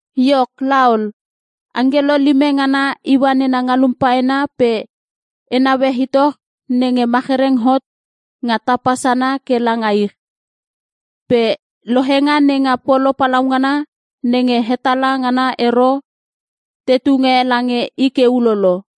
Iok laol, angkelo lime ngana iua nena ngalum paena pe e naue itoch nenge machereng hot nga tapa sana ke langa ich. Pe lohenga nenga polo palaungana nenge hetala ngana ero te tunge lange i ke ulolo.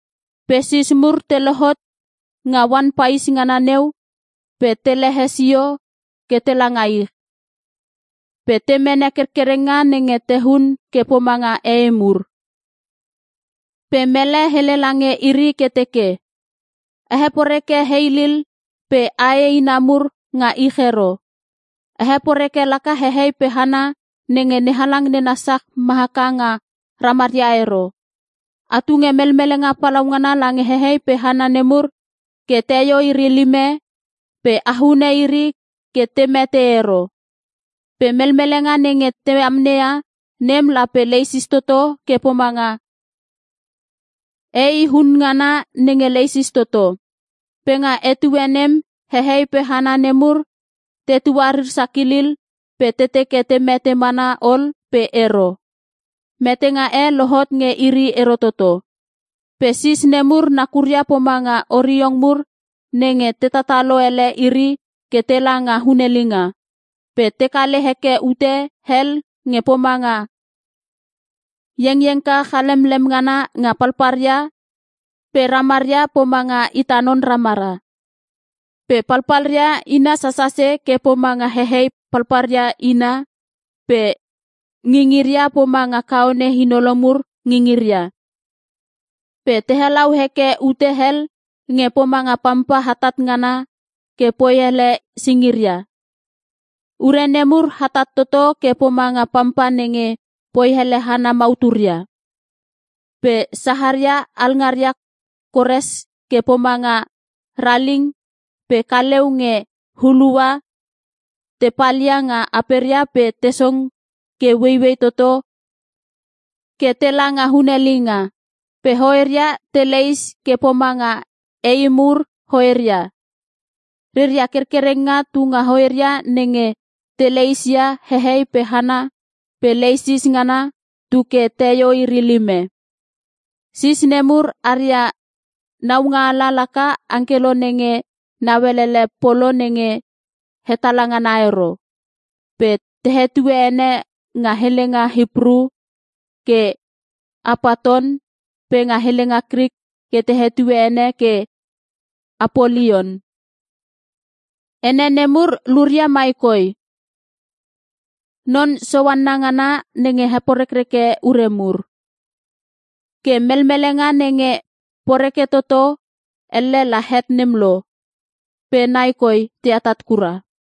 Pe sis mur te lohot nga oan pais ngana neu pe te lehe sio ke tela nga ich. Pe te mene kerkerenga nenge tehun ke pomanga ei mur. Pe mele hele lange iri ke teke, “A heporeke heilil pe ae ina mur nga ich ero. A heporeke laka hehei pe hana nenge NeHalang nena sach ma haka nga ramaria ero. A tunge melmelenga palaungana lange hehei pe hana nemur ke teio iri lime pe a hune iri ke te mete ero.” Pe melmelenga nenge te amneia nem lape leisis toto ke pomanga ei hun ngana nenge leisis toto. Pe nga etue nem hehei pe hana nemur te tuarir sakilil pe te teke te mete mana ol pe ero. Metenga e lohot nge iri ero toto. Pe sis nemur nakuria pomanga oriong mur nenge te tatalo ele iri ke tela nga hunelinga. Pe te kale heke ute hel nge pomanga iengiengka chalemlem ngana nga palpalria pe ramaria pomanga ita non ramara. Pe palpalria ina sasase ke pomanga hehei palpalria ina pe ngingiria pomanga kaone inolo mur ngingiria. Pe te helau heke ute hel nge pomanga pampa hatat ngana ke poi hele singiria. Ure nemur hatat toto ke pomanga pampa nenge poi hele hana mauturia. Pe saharia alngaria kores ke pomanga raling pe kaleu nge hulua te palia nga aperia pe te song ke ueiuei toto ke tela nga hunelinga. Pe hoeria te leis ke pomanga ei mur hoeria. Reria kerkerenga tunga hoeria nenge te leisia hehei pe hana pe leisis ngana tuke teio iri lime. Sis nemur aria naungaala laka angkelo nenge nauelele polo nenge hetala ngana ero. Pe te hetue ene nga helenga Hipru ke Apaton pe nga helenga Krik te hetue ene ke Apolion. (Ene nemur luria mai koi - Non Soanna ngana nenge heporekreke ure mur.) Ke melmelenga nenge poreke toto, elle la het nem lo, pe nai koi te atat kura.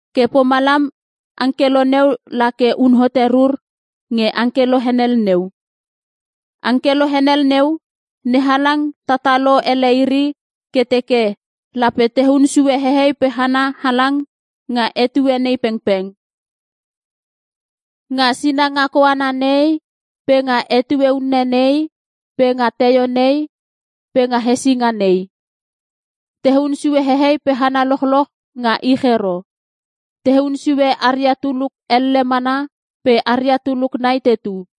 Ke pomalam angkelo neu la ke un hote rur nge angkelo henel neu. Angkelo henel neu, NeHalang tatalo ele iri ke teke lape tehun sue hehei pe hana halang nga etue nei pengpeng. Nga sinanga koana nei, pe nga etue unne nei, pe nga teio nei, pe nga hesinga nei. Tehun sue hehei pe hana lochloch nga ich ero. Tehun sue aria tuluk elle mana pe aria tuluk nai tetu.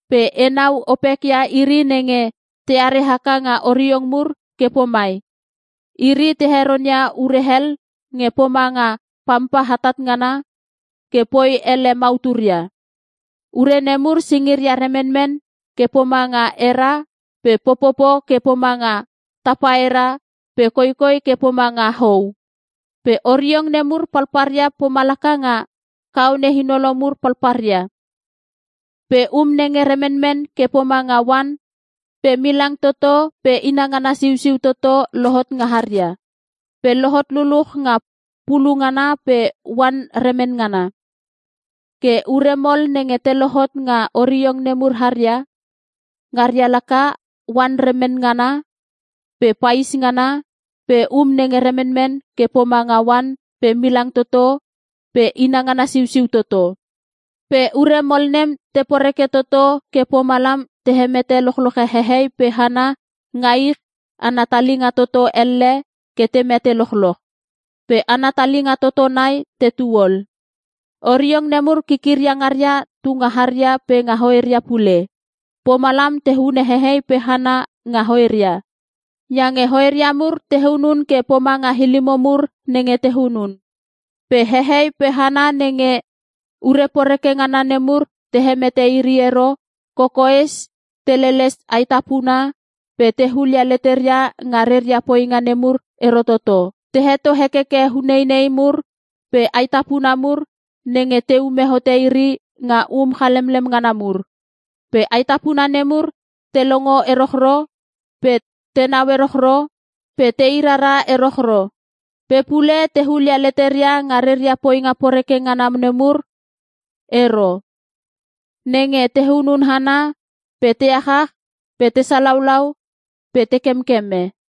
Pe enau opekia iri nenge teare haka nga oriong mur ke pomai: Iri te heronia ure hel nge pomanga pampa hatat ngana ke poi ele mauturia. Ure nemur singiria remenmen ke pomanga era pe popopo ke pomanga tapaera pe koikoi ke pomanga hou. Pe oriong nemur palpalria pomalaka nga kaone inolo mur palpalria. Pe um nenge remenmen ke pomanga oan pe milang toto pe inangana siusiu toto lohot nga haria. Pe lohot luluch nga pulu ngana pe oan remen ngana. Ke ure mol nenge te lohot nga oriong nemur haria, ngaria laka; oan remen ngana, pe pais ngana, pe um nenge remenmen ke pomanga oan pe milang toto pe inangana siusiu toto. Pe ure mol nem te poreke toto, ke pomalam te hemete lochloche hehei pe hana nga ich ana talinga toto elle ke te mete lochloch. Pe ana talinga toto nai tetu ol. Oriong nemur kikiria ngaria tunga haria pe nga hoeria pule. Pomalam te hunune hehei pe hana nga hoeria. Iange hoeria mur te hunun ke pomanga ilimo mur nenge te hunun. Pe hehei pe hana nenge ure poreke ngana nemur te hemete iri ero, kokoes te leles aetapuna pe te hulia leteria nga reria poinga nemur ero toto. Te heto hekeke uneinei mur pe aetapuna mur nenge teume hote iri nga um chalemlem ngana mur. Pe aetapuna nemur te longo erochro, pe tenau erochro, pe te irara erochro. Pe pule te hulia leteria nga reria poinga poreke ngana nemur ero. Nenge te hunun hana, pe te achach, pe te salaulau, pe te kemkeme.